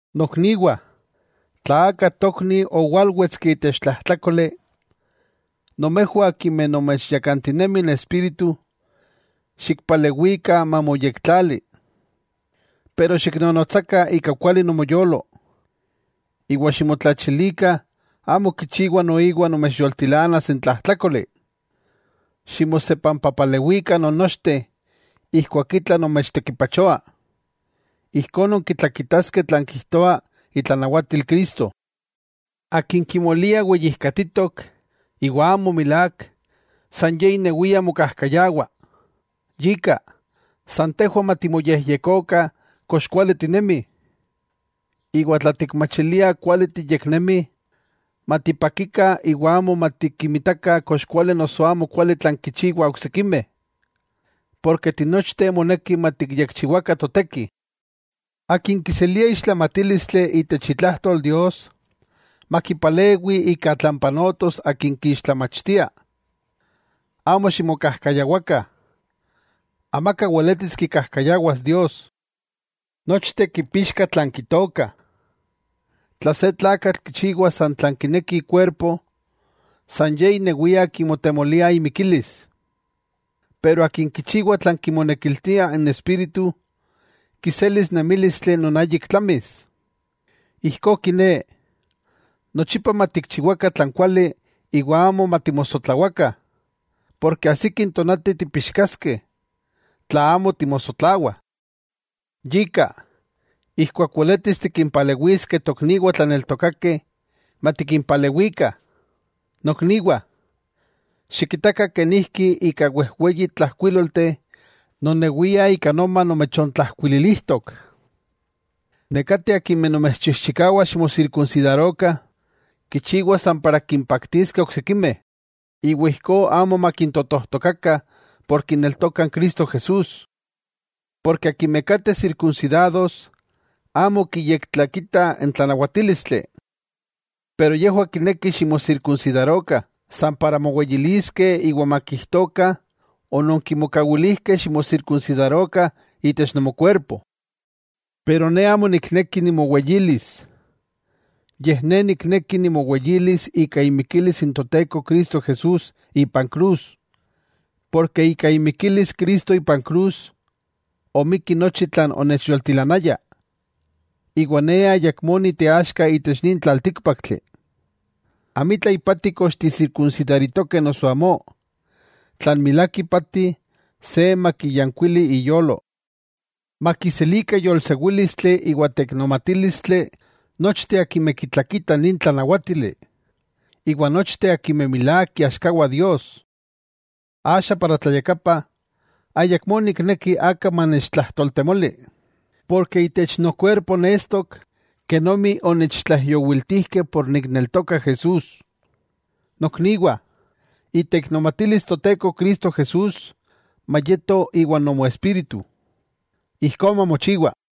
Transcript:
Nokniwah, tla aka tokni owalwetski itech tlajtlákoli, nomejwah akimeh nomechyakantinemi n Espíritu, xikpalewikah mamoyektlali. Pero xiknonotsakah ika kuali nomoyolo, iwa ximotlachilikah amo kichiwa noiwa nomechyoltilanas n tlajtlákoli. Ximosepampapalewikah nonnochteh ijkuak itla nomechtekipachoa, ijkó nonkitlakitaskeh tlan kijtoa itlanawatil Cristo. Akin kimolia weyijkatitok, iwa amo milák, san ye inewia mokajkayawah. Yika, san tejwah matimoyejyekokah kox kuali tinemih, iwa tla tikmachiliah kuali tiyeknemih, matipakikah iwa amo matikimitakah kox kuali noso amo kuali tlan kichiwah oksikimeh. Porke tinochteh moneki matikyekchiwakah toteki. Akin kiselia ixtlamatílistli itech itlajtol Dios, makipalewi ika tlan panotos akin kiixtlamachtia. Amo ximokajkayawakah: amaka weletis kikajkayawas Dios. Nochteh kipixkah tlan kitookah. Tla se tlakatl kichiwa san tlan kineki ikuerpo, san ye inewia kimotemolia imikilis. Pero akin kichiwa tlan kimonekiltia n Espíritu, kiselis nemílistli non ayik tlamis. Ijkó kiné, nochipa matikchiwakah tlan kuali iwa amo matimosotlawakah, porke ajsiki n tonati tipixkaskeh, tla amo timosotlawah. Yika, ijkuak weletis tikinpalewiskeh tokniwah tlaneltokakeh, matikinpalewikah. Nokniwah, xikitakah kenijki ika wejweyi tlajkuílolteh nonewia ika noma nomechontlajkuililijtok. Nekateh akimeh nomechchijchikawah ximosirkunsidarokah, kichiwah san para kimpaktiskeh n oksikimeh, iwa ijkó amo makintotojtokakah por kineltokah n Cristo Jesús. Porke akimeh kateh sirkunsidados amo kiyektlakitah n tlanawatílistli. Pero yejwah kinekih ximosirkunsidarokah, san para moweyiliskeh iwa makijtokah ononkimokawilijkeh ximosirkunsidarokah itech nomokuerpo. Pero ne amo nikneki nimoweyilis, yej ne nikneki nimoweyilis ika imikilis n Toteko Cristo Jesús ipan krus. Porke ika imikilis Cristo ipan krus, omikki nochi tlan onechyoltilanaya, iwa ne ayakmó niteaxka itech nin tlaltíkpaktli. Amitla ipati kox tisirkunsidaritokeh noso amó, tlan milák ipati se makiyankuili iyolo. Makiselikah yolsewílistli iwa teiknomatílistli nochteh akimeh kitlakitah nin tlanawátili, iwa nochteh akimeh milák iaxkawah Dios. Axa ik tlayakapa ayakmó nikneki aka manechtlajtoltemoli, porke itech nokuerpo nestok kenomi onechtlaijyowiltijkeh ken nikneltoka Jesús. Nokniwah iteiknomatilis Toteko Cristo Jesús mayeto iwan nomoespíritu. Ijkó mamochiwa.